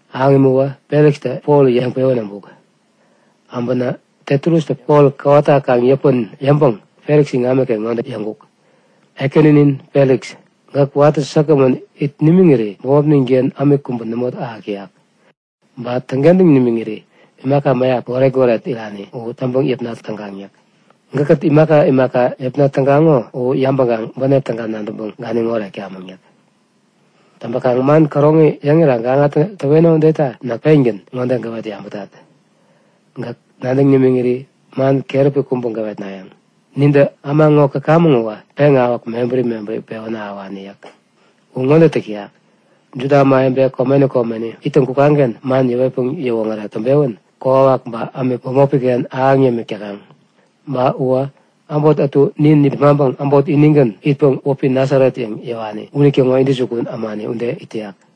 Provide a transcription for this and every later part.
Ahäŋ imäwä Felikstä Polta yäŋpewän äbuk. Äbänä Tetulustä Pol kowata kaŋ yäpän yäŋpäŋ Feliks iŋamiken ŋode yäŋkuk; Ekäninin Feliks, gäk watä säkgämän it nimiŋiri bämopnin-ken ämik kubä nämo ahäk yäk. Ba täŋkentäŋ nimiŋiri imaka mäyap goret-goret irani u täŋpäŋ yäpna tägaŋ yäk. Gäkkät imaka imaka yäpna tägaŋo u yabäŋkaŋ bänep täga nadäŋpäŋ ganiŋ oretkamäŋ yäk. Täŋpäkaŋ man käroŋi yäŋira gaŋa täweno udeta näk pengän ŋode gäwet yabätat; Gäk nadäŋ nimiŋiri man keräpi kubä gäwetnayäŋ. Nintä äma ŋo käkamäŋ uwä peŋawäk mebäri mebäri pewän ahäwani yäk. U ŋode täk täyak; Juda ämawebe komeni komeni ittäŋ kukaŋ-ken man yäwetpäŋ yäwoŋärek täŋpewän kokwawak ba ämik bämopi-ken ahäŋ yämik täkaŋ. Ba uwä äbot ätu nin nipmaŋpäŋ äbot inigän itpäŋ wäpi Nasaret yäŋ yäwani unitäŋo intäjukun ämani ude itak yäk.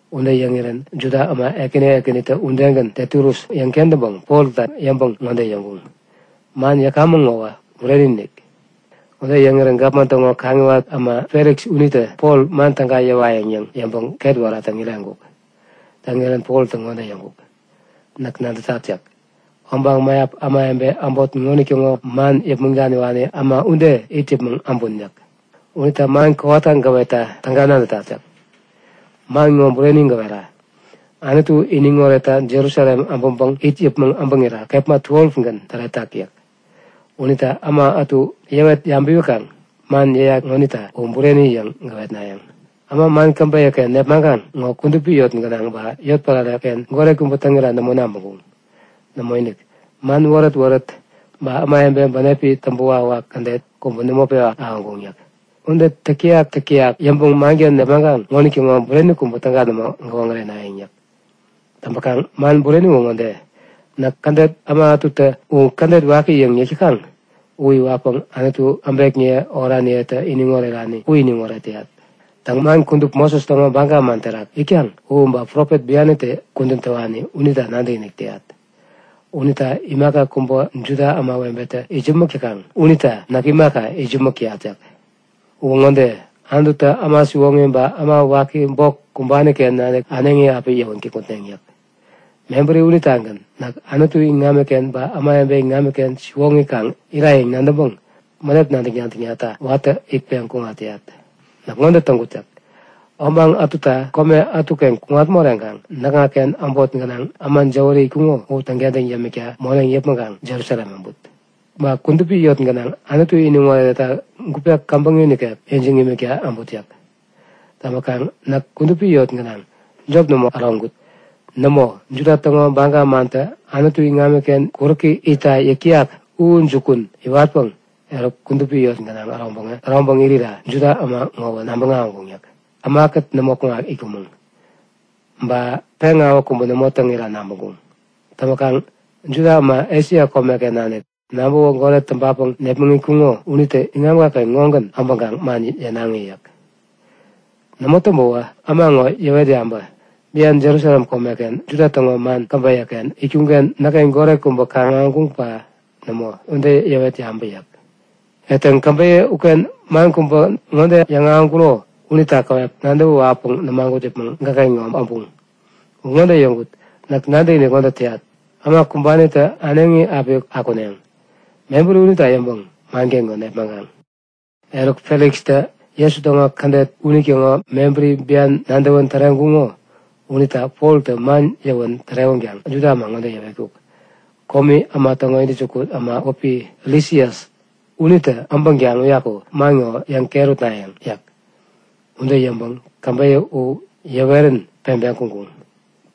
Ude yäŋirän Juda äma ekäni ekänitä udegän Tetulus yäŋ-kentäŋpäŋ Polta yäŋpäŋ ŋode yäŋkuŋ; Man yäkamäŋ ŋowä bureni-inik! Ude yäŋirä gapman täŋo kaŋiwat äma Feliks unitä Pol man täga yäwayäŋ yäŋ yäŋpäŋ ketwära täŋireŋkuk. Täŋirän Poltä ŋode yäŋkuk; Näk nadätat yäk. Obaŋ mäyap ämawebe äbot ŋonitäŋo man yäpmäŋ daniwani äma ude it yäpmäŋ äbun yäk. Unita man kowata gäwetta täga nadätat yäk. Man ŋo bureni gäwera. Anutu iniŋ oretta Jerusalem äbäŋpäŋ it yäpmäŋ äbäŋira kepma 12gän täretak yäk. Unita äma ätu yäwet yabäwikaŋ man yäyat ŋonita u bureni yäŋ gäwetnayäŋ. Äma man käbeyä-ken nepmaŋkaŋ ŋo kudupi yot gänaŋ ba yotpärare-ken goret kubä täŋira nämo nabäŋkuŋ. Nämoinik! Man wärät-wärät ba ämawebe bänepi täŋpäwak-wak kädet kubä nämo pewa ahäŋkuŋ yäk. Ude täk-täyak täk-täyak yäŋpäŋ manken nepmaŋkaŋ ŋonitäŋo bureni kubä täga nämo gäwoŋärenayäŋ yäk. Täŋpäkaŋ, man bureni u ŋode; Näk Kädet äma ätutä U kädet waki yäŋ yäk täkaŋ u iwatpäŋ Anutu, äbekniye oraniyetä iniŋ orerani u iniŋoret täyat. Täŋ, man kudup Moses täŋo baga man terak itkaŋ u ba profet bianitä kudän täwani unita nadäkinik täyat. Unita imaka kubä Juda ämawebetä itsämäk täkaŋ unita näk imaka, itsämäk täyat yäk. Uwä ŋode; Anututä äma siwoŋi ba äma waki bok kumbani-ken nanik äneŋi api yäwän kikŋutneŋ yäk. Mebäri unitagän näk Anutu iŋamiken ba ämawebe iŋamiken siwoŋi kaŋ ira yäŋ nadäŋpäŋ bänep nadäk-nadäknata watäni itpeŋ kuŋat täyat. Näk ŋode täŋkut yäk. Obaŋ ätuta kome ätuken kuŋat moreŋkaŋ näkŋaken äbot gänaŋ äma jäwäri itkuŋo u täŋkentäŋ yämikta moneŋ yäpmäŋkaŋ Jerusalem äbut. Ba kudupi yot gänaŋ Anutu iniŋoretta gupe käbäŋi nikek ijiŋ imikta äbut yäk. Täŋpäkaŋ näk kudupi yot gänaŋ jop nämo äroŋkut. Nämo, Juda täŋo baga mantä Anutu iŋamiken kuräki itta yäk täyak u jukun iwatpäŋ eruk kudupi yot gänaŋ äroŋpäŋ irira Juda äma ŋowä nabäŋ ahäŋkuŋ yäk. Näk ämakät nämo itkumäŋ. Ba peŋawäk kubä nämo täŋira nabäŋkuŋ. Täŋpäkaŋ Juda äma Esia komeken nanik, nabäwä goret täŋpapäŋ nepmäŋitkuŋo unitä iŋamka-ken ŋogän äbäkaŋ man yänaŋi yäk. Nämo täŋpäwä, äma ŋo yäwet yabä. Bian Jerusalem komeken Juda täŋo man käbeyä-ken itkuŋ-ken näkken goret kubä kaŋ-ahäŋkuŋ ba nämo? Ude yäwet yabä yäk. Etäŋ, käbeyä uken man kubä ŋode yäŋahäŋkuro unita käwep nadäwä wawäpäŋ nämagut yäpmäŋ gäkken ŋo äbuŋ. U ŋode yäŋkut; Näk nadäkinik ŋode täyat; Äma kumbanitä äneŋi api akuneŋ. Mebäri unita yäŋpäŋ manken ŋo nepmaŋkaŋ. Eruk, Felikstä Jesu täŋo Kädet unitäŋo mebäri bian nadäwän täreŋkuko unita Poltä man yäwän tärewäkaŋ Juda äma ŋode yäwetkuk; Komi äma täŋo intäjukun äma wäpi Lisias unitä äpänkaŋ uyaku man ŋo yäŋket utnayäŋ yäk. Ude yäŋpäŋ käbeyä u yäwerän peŋpeŋ kuŋkuŋ.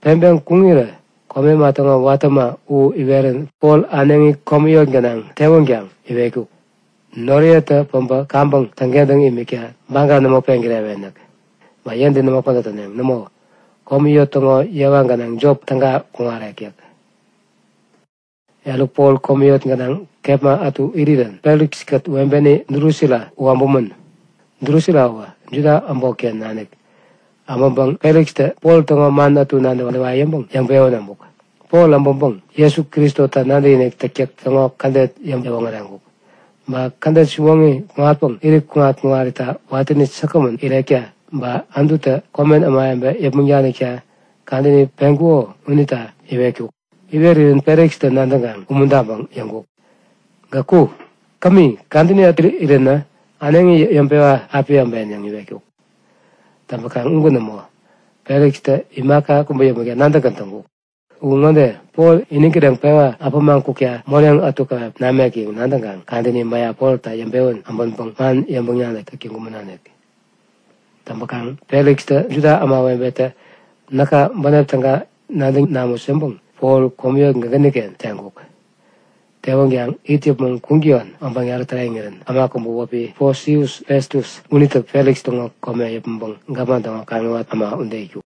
Peŋpeŋ kuŋirä komi äma täŋo watä äma u iwerän Pol äneŋi komi yot gänaŋ tewänkaŋ iwetkuk; Noriyetä päbä kaŋpäŋ täŋkentäŋ imikta baga nämo peŋkirewen yäk. Ba yentä nämo pädät täneŋ. Nämo, komi yot täŋo yewa gänaŋ jop täga kuŋarek yäk. Eruk Pol komi yot gänaŋ kepma ätu irirän Feliks-kät webeni Drusila u äbumän. Drusila uwä Juda äbotken nanik. Äbäŋpäŋ Felikstä Pol täŋo man ätu nadäwayäŋ yäŋpäŋ yäŋpewän äbuk. Pol äbäŋpäŋ Jesu Kristota nadäkinik täktäk täŋo kädet yäŋpäŋ-iwoŋäreŋkuk. Ba kädet siwoŋi kuŋatpäŋ irit kuŋat-kuŋarita watäni säkgämän irekta ba Anututä komen ämawebe yäpmäŋ daniwekta kadäni peŋkuko unita iwetkuk. Iwerirän Felikstä nadäŋkaŋ umuntaŋpäŋ yäŋkuk; Gäk ku! Kämi, kadäni ätu iränä äneŋi yäŋpewa api äben yäŋ iwetkuk. Täŋpäkaŋ ugän nämo. Felikstä imaka kubä yäpmäkta nadäkgän täŋkuk. U ŋode; Poltä iniŋ kireŋpewa äpämaŋ kukta moneŋ ätu käwep namek yäŋ nadäŋkaŋ kadäni mäyap Polta yäŋpewän äbänpäŋ man yäŋpäŋ-nadäk täk täŋkumänonik. Täŋpäkaŋ Felikstä Juda ämawebetä näka bänep täga nadäŋ namut yäŋpäŋ Pol komi yot gänaŋgän teŋkuk. Tewänkaŋ it yäpmäŋ kuŋtäyon obaŋ yarä täreŋirän äma kubä wäpi Posius Festus unitä Feliks täŋo kome yäpmäŋpäŋ gapman täŋo kaŋiwat äma ude itkuk.